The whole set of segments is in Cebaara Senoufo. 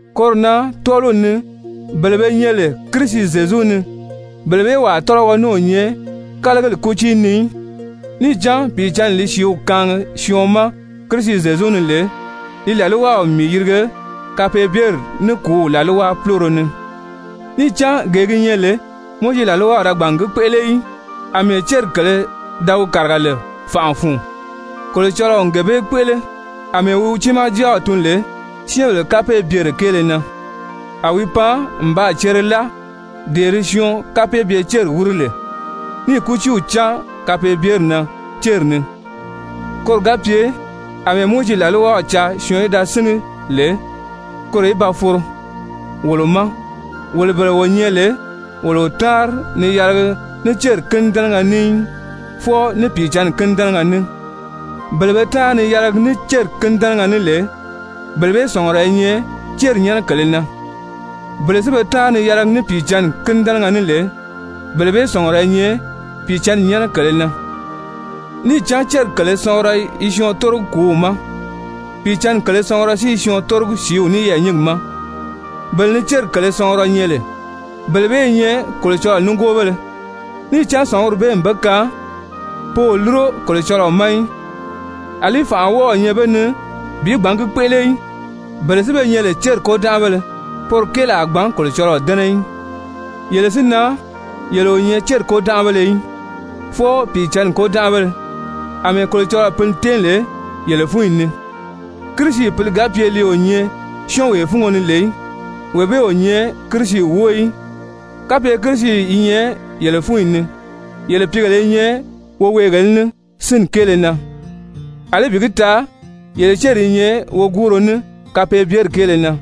Koro na tɔ́ɔliw ni bele be nyɛ lè Kirisi Zyezu ni, bele bee wàa tɔ́lɔgɔ ní o nyɛ kálagili kútii ni í. Níì cán Pìicǎnni li sìíw kaangi syɔɔn ma Kirisi Zyezu ni lè, li làlwaw n mii yirige kapeebyeri ní kùúw làlwa púloro ni. Níì cán gee gi nyɛ lè Mowizi làlwaw da gbàn n gi kpéʔele í, àmɛɛ céri kèlē da wi kàriga lè fànʔa fun, Kolocɔlɔɔ n gee bee kpéʔele, àmɛɛ wi wi tiimaa Jáaw tun lè syɛ́ɛnbèle kapeebyere kéele na, a wi pan n baa cere láa dee di syɔɔn kapeebye-céri wíri lè, níì kútii cáan kapeebyeri na céri ni, koro ga pye àmɛɛ Mowizi làlwaw caa syɔɔn í da síngi lè, koro í ba foro wolo ma, wolo bele wo nyɛ lè wolo o táanri ni yɛlɛgi ní céri kínidɛnɛgɛ ní í, fwɔɔ ní Pìicǎnni kínidɛnɛgɛ ní. Bele be táanri ni yɛlɛgi ní céri kínidɛnɛgɛ ní lè, bele bee sɔ̀ngurɔ i nyɛ céri nyɛ́nɛ kèlē na, bele si be táanri ni yɛlɛgi ní Pìicǎnni kínidɛnɛgɛ ní lè, bele bee sɔ̀ngurɔ i nyɛ Pìicǎnni nyɛ́nɛ kèlē na. Níì cán céri kèlē sɔngurɔ i syɔɔn tórogi kùúw ma, Pìicǎnni kèlē sɔngurɔ si i syɔɔn tórogi sìíw ní yɛɛ̀nyingi ma. Bele ni céri kèlē sɔngurɔ nyɛ lè, bele bee i nyɛ Kolocɔlɔɔ nígoobéle, níì cán sɔ̀nguri bee n be kaan pe o lúro Kolocɔlɔɔ ma í, àlí fànʔa o wɔ́ɔ̄ nyɛ be ni bi gbǎn gi kpéʔele í. Bele si be nyɛ lè céri kôdanʔabéle, poro kéeli a gbǎn Kolocɔlɔɔ dɛ́nɛ í. Yele si na, yele o nyɛ céri kôdanʔabéle í, fwɔɔ Pìicǎnni kôdanʔabéle àmɛɛ Kolocɔlɔɔ Pǐli tɛ́ɛn lè yele fúnyi ni. Kirisi Pǐli ga pye li o nyɛ syɔ́ɔnwee fúngo ni lè í, wee bee o nyɛ Kirisi wóo í. Kapye Kirisi i nyɛ yele fúnyi ni yele pìígèle i nyɛ woweegèlē ní sínni kéele na, àlí bi gi taa yele céri i nyɛ woguuro ní kapeebyeri kéele na.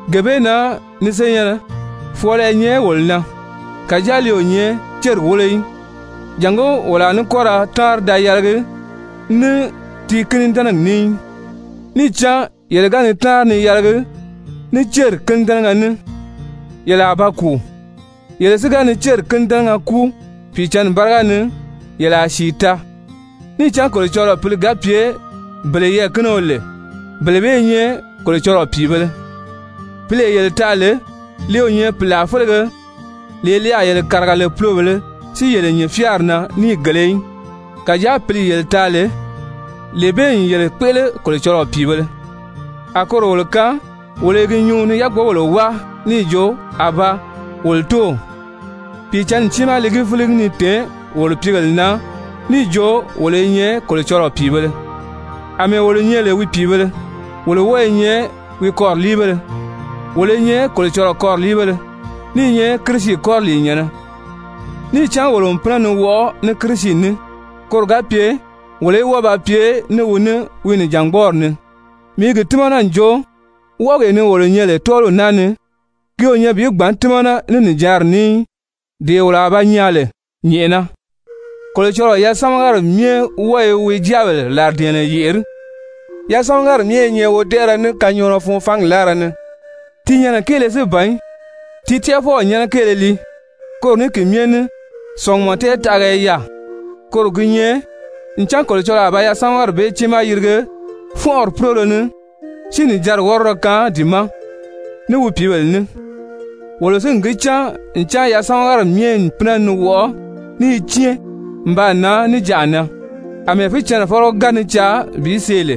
Gee bee na ni senyɛ̀nnɛ, fwɔɔlɔ i nyɛ wolo na, kàjáa li o nyɛ céri wólo í, jàngó wolo a ní kɔ́ ra táanri da yɛlɛgi ní ti kínidɛnɛgi ní í. Níì cán yele ga ni táanri ni yɛlɛgi ní céri kínidɛnɛgɛ ní, yele a ba kùu. Yele si ga ni céri kínidɛnɛgɛ kúu Pìicǎnni báriga ni, yele a sìi taa. Níì cán Kolocɔlɔɔ Pǐli ga pye bele yɛɛ̀kinio lè, bele bee i nyɛ Kolocɔlɔɔ pìibēle. Pǐlee yele taa lè, li o nyɛ pìlaa félege, lee li a yele kàriga lè pulobèlē si yele nyìn fyáari na níìgēle í, kàjáa Pǐli yele taa lè, lee bee n yele kpéʔele Kolocɔlɔɔ pìibēle, a koro wolo kaan wolo i gi nyuu ni yákpogèle wáa níì jo: «Abaa! Wolo Tóow!» Pìicǎnni tiimaa li gi fíligi ni tèé wolo pìígèle na níì jo wolo i nyɛ Kolocɔlɔɔ pìibēle. Amɛɛ wolo nyɛ lè wi pìibēle, wolo wɔ́ɔ i nyɛ wi kɔriliibéle, wolo i nyɛ Kolocɔlɔɔ kɔriliibéle ní i nyɛ Kirisi kɔriliinyɛ̀nnɛ, níì cán wolo n pínɛ ni wɔʔɔ ní Kirisi ní, koro ga pye wolo í wɔ́ɔ ba pye ní wi ní wi nìjangbɔɔri ni. Mii i gi tímana n jo wɔʔɔgee ni wolo nyɛ lè tɔ́ɔliw naa ni, ki o nyɛ bi gbǎn tímana ní nìjanri ní í, dee wolo a ba nyaa lè nyɛ̀ʔɛna. Kolocɔlɔɔ yasamagari myɛ wɔ́ɔ i wi jáabèle làridɛ̀ɛnnɛ yèʔerí. Yasamagari myɛ i nyɛ wodɛʔɛrɛ ní kanyɔɔnɔ fun fangi láara ni, ti nyɛnɛ kéele si ban í, ti tɛ́ʔɛfɔw nyɛ́nɛ kéele lii, koro ní ki myɛ ní sɔ̀ngumɔ tɛɛtaʔaga i yaà, koro gi nyɛ, ncan Kolocɔlɔɔ a ba yasamagari bee tiimaa yirige fɔ́nʔɔri púloro ni si nìjanri wɔ́rɔdɔ kaan di ma ní wi pìíbèle ní. Wolo si n gi cán ncan yasamagari myɛ n pínɛ ni wɔʔɔ ní i cɛ́ɛn n baa nan níjanʔa na, àmɛɛ fícɛnnɛfɔlɔ ga ni caa bi see lè.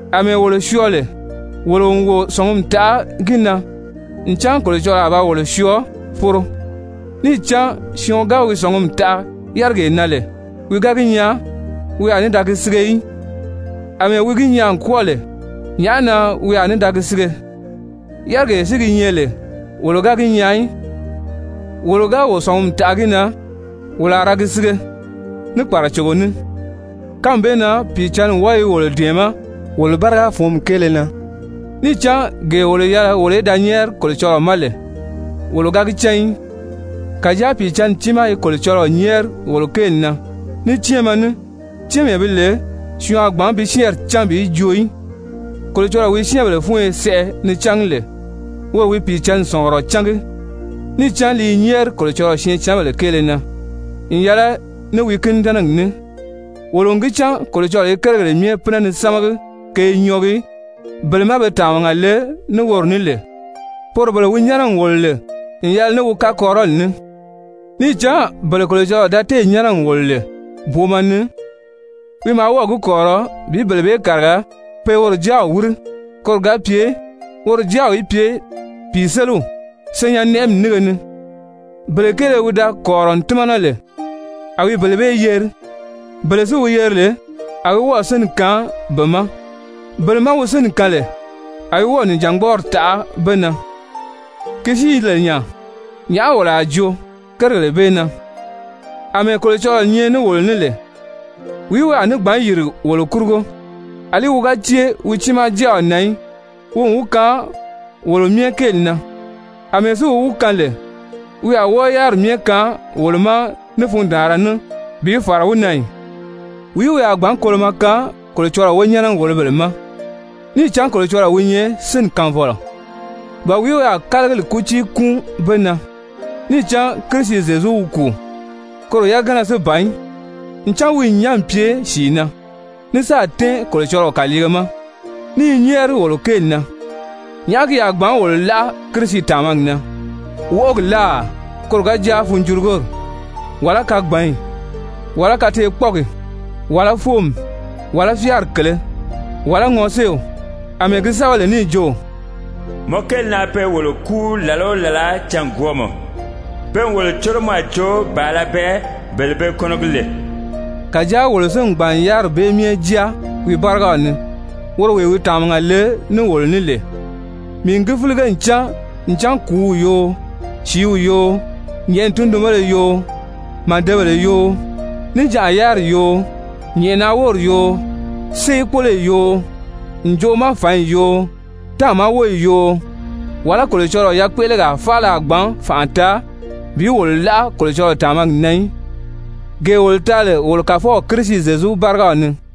Amɛɛ wolo syɔɔ lè, wolo n wo sɔ̀ngumi taʔa gi na ncan Kolocɔlɔɔ a ba wolo syɔɔ foro. Níì cán syɔɔn ga wi sɔ̀ngumi taʔa yárigee na lè, wi ga gi nyaa, wi a ní da gi sige í, àmɛɛ wi gi nyaa n kwɔ́ɔ lè, nyàʔá na wi a ní da gi sige? Yárigee si gi nyɛ lè wolo o gi nyaagi í, wolo ga wo sɔ̀ngumi taʔa gi na, wolo a ra gi sige ní kpàracogo ní. Kánmi bee na Pìicǎnni wɔ́ɔ i wolo dɛ̀ɛmɛ́ wolo báriga fǔnmi kéele na, níì cán gee wolo yɛlɛ wolo í da nyɛ́ɛri Kolocɔlɔɔ ma lè, wolo ga gi cán í. Kàjáa Pìicǎnni tiimaa i Kolocɔlɔɔ nyɛ́ɛri wolo kéeli na ní cɛ́ɛnmɛ ní, cɛ́ɛnmee bi lè syɔɔn a gbǎn bi syɛ́ɛnri cán bi joo í. Kolocɔlɔɔ wi syɛ́ɛnbèle fúnyo sɛʔɛ ni cángi lè, woro wi Pìicǎnni sɔ̀ngurɔ cángi, níì cán li i nyɛ́ɛri Kolocɔlɔɔ syɛɛncanbèle kéele na n yɛlɛ ní wi kínidɛnɛgi ní. Wolo n gi cán Kolocɔlɔɔ i kérigèle myɛ pínɛ ni sámagi ke i nyɔɔgi bele má be tàmaga le ní woro ní lè, poro bele wi nyɛ́nɛ n wòlo lè n yɛlɛ ní wi kakɔrirɔli ní. Níì cán bele Kolocɔlɔɔ da téè nyɛ́nɛ n wòlo lè booma ni, wi maa wɔ́ɔ̀ gi kɔ̀rirɔ bi bele bee kàriga pe woro Jáaw wíri, koro ga pye woro Jáaw í pye pìiseliw senyɛn-nɛʔɛmi nínge ni. Bele kéele wi da kɔ̀rirɔ n tímana lè, a wi bele bee yeri. Bele si wi yeri lè, a wi wɔ́ɔ̀ sínni kaan be ma, bele má wi sínni kaan lè, a wi wɔ́ɔ̀ nìjangbɔɔri taʔa be na. Ki si i lè nya, nyàʔá wolo a joo kérigèle bee na? Amɛɛ Kolocɔlɔɔ nyɛ ní wolo ní lè, wìí wi a ní gbǎn yìri wolo kurugo? Alí wi ga cée wi tiimaa Jáaw na í, wi n wi kaan wolo myɛ kéeli na, àmɛɛ si wi wi kaan lè, wi a wɔ́ɔ yáriri myɛ kaan wolo ma ní fundaanra ní bi fàra wi na ì? Wìí wi a gbǎn kolomɔ kaan Kolocɔlɔɔ wonyɛnɛ-wòlobèle ma? Níì cán Kolocɔlɔɔ wi nyɛ sínni kaanfɔlɔ. Ba wìí wi a kálagili kútii kúun be na? Níì cán Kirisi Zyezu wi kùu. Koro yagana si ban í, ncan wi n nyán n pye sìi na, ní sáà tɛ́ɛn Kolocɔlɔɔ kàliige ma, ní i nyɛ́ɛri wolo kéeli na! Nyàʔá ki a gbǎn wolo láʔa Kirisi tàmagi na? Wɔʔɔgi láà, koro ga jáa funjurugori, wàlá kagbanyi, wàlá kateekpɔɔgi, wàlá fóomi, wàlá fyáari kèlē, wàlá ŋɔséew? Amɛɛ gi sɛ́bɛ lè níì jo: «Mɔ kéeli na pe wolo kúu làla o làla cângwɔɔmɔ. Pe n wolo córo mɔ a jo bàala bɛɛ bele be kɔnɔgi lè.» Kàjáa wolo si n gbàn n yáriri bee myɛ jáa wi bárigaw ni woro wee wi tàmaga le ní wolo ní lè. Mii n gi fílige n cán ncan kùúw yoo, sìíw yoo, nyɛ̀ʔɛni tundunbéle yoo, màdebèle yoo, níjanʔa yáriri yoo, nyɛ̀ʔɛna wóri yoo, séekpoloyi yoo, ǹjoʔo ma fǎnyi yoo, táàma wóyi yoo, wàlá Kolocɔlɔɔ yakpéʔelegaa faala a gbǎn fànʔa taa bi wolo láʔa Kolocɔlɔɔ tàmagi na í, gee wolo taa lè wolo Kàfɔw Kirisi Zyezu bárigaw ni.